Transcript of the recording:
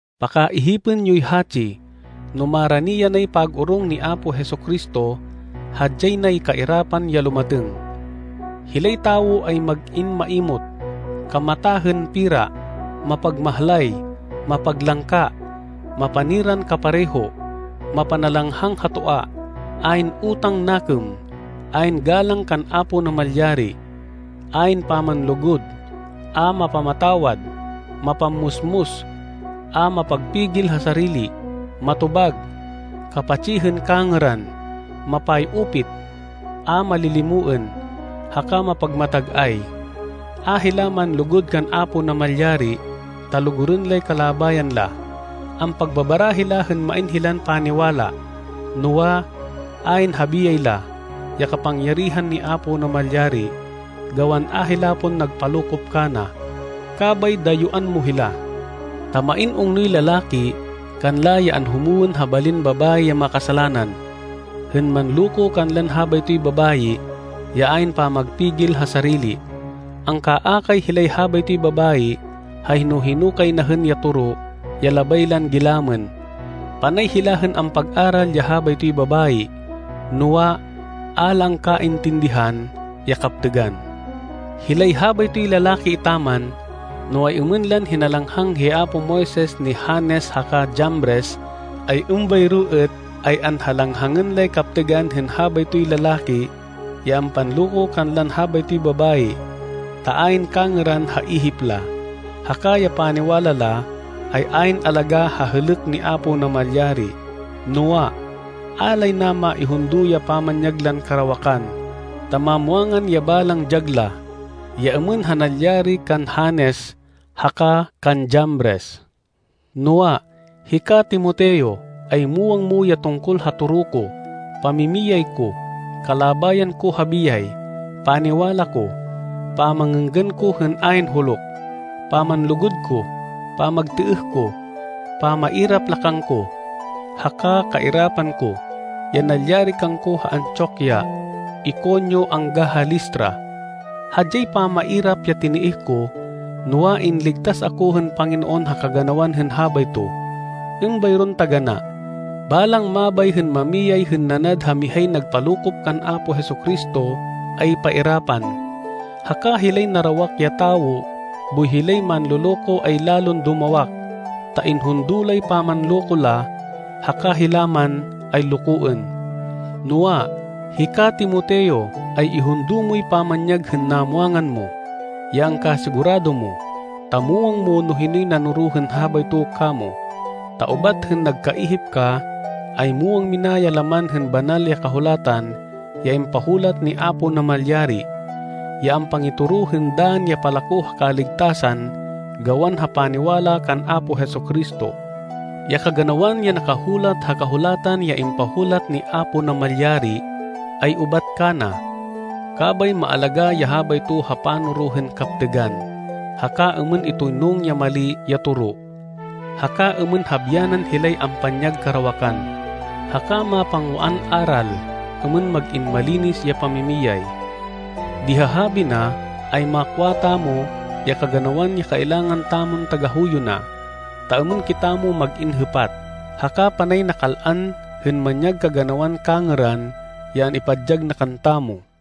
Pakaihipên yoy hatsi, no marani yanay pag-orong ni Apo Jesu-Cristo, hadyay nay kairapan ya lumatêng. Hilay tawo ay mag-in maimot, kamata hên pera, mapagmahlay, mapaglangka, mapaniran kapareho, mapanalanghang ha toa, ayn utang nakêm, ayn galang kan Apo Namalyari, ayn pamanlugud, a mapamatawad, mapammusmus, a mapagpigil ha sarili, matobag, kapatsi hên kangêran, mapay-upit, a malilimoên, haka mapagmatag-ay. A hila manlugud kan Apo Namalyari ta lugurên lay kalabayan la. Ampagbabara hila hên main hilan paniwala, noa, ayn ha biyay la, ya kapangyarihan ni Apo Namalyari, gawan a hila pon nagpalokop kana. Kabay dayuán mo hila. Ta main ungnoy lalaki kanla ya anhumwên ha balin babayi ya makasalanan, hên manloko kanlan habaytoy babayi ya ayn pamagpigil ha sarili. Angkaakay hilay habaytoy babayi ha hino-hino kay na hên ya toro ya labay lan gilamên. Panay hila hên ampag-aral ya habaytoy babayi, noa, a la angkaintindihan ya kaptêgan. Hilay habaytoy lalaki etaman, no ay-êmên lan hinalanghang hi apo Moises ni Janes haka Jambres, ay êmbayro êt ay anhalanghangên lay kaptêgan hên habaytoy lalaki ya ampanloko kanlan habaytoy babayi, ta ayn kangêran ha ihip la, haka ya paniwala la, ay ayn alagá ha hêlêk ni Apo Namalyari. Noa, a lay na maihundo ya pamanyag lan karawakan, ta mamwangan ya balang dyag la, ya êmên ha nalyari kan Janes haka kan Jambres. Noa, hika Timoteo, ay muwang mo ya tungkol ha toro ko, pamimiyay ko, kalabayan ko ha biyay, paniwala ko, pamangênggan ko hên ayn huluk, pamanlugud ko, pamagtêêh ko, pamairap la kangko, haka kairapan ko, ya nalyari kangko ha Antioquia, Iconio angga ha Listra. Hadyay pamairap ya tinêêh ko, noa, inligtas ako hên Panginoon ha kaganawan hên habayto. Êmbayron taganá. Balang mabay hên mamiyay hên nanad ha mihay nagpalokop kan Apo Jesu-Cristo ay pairapan. Haka hilay narawak ya tawo boy hilay manloloko ay lalon dumawak, ta inhundo lay pamanloko la, haka hila man ay lokoên. Noa, hika, Timoteo, ay ihundo moy pamanyag hên namwangan mo, ya angkasigurado mo, ta muwang mo no hinoy nanoro hên habayto kamo. Ta ubat hên nagkaihip ka, ay muwang mina ya laman hên Banal ya Kahulatan ya impahulat ni Apo Namalyari, ya ampangitoro hên dann ya palako ha kaligtasan gawan ha paniwala kan Apo Jesu-Cristo. Ya kaganawan ya nakahulat ha Kahulatan ya impahulat ni Apo Namalyari, ay ubat kana. Kabay maalagá ya habayto ha panoro hên kaptêgan, haka êmên itoynung ya mali ya toro, haka êmên habyanan hilay ampanyag karawakan, haka mapangwaan aral êmên mag-in malinis ya pamimiyay. Di ha habi na, ay makwa tamo, ya kaganawan ya kailangan tamon tagahuyo na, ta êmên kitamo mag-in hêpat, haka panay nakal-an hên manyag kaganawan kangêran ya an-ipadyag na kantamo.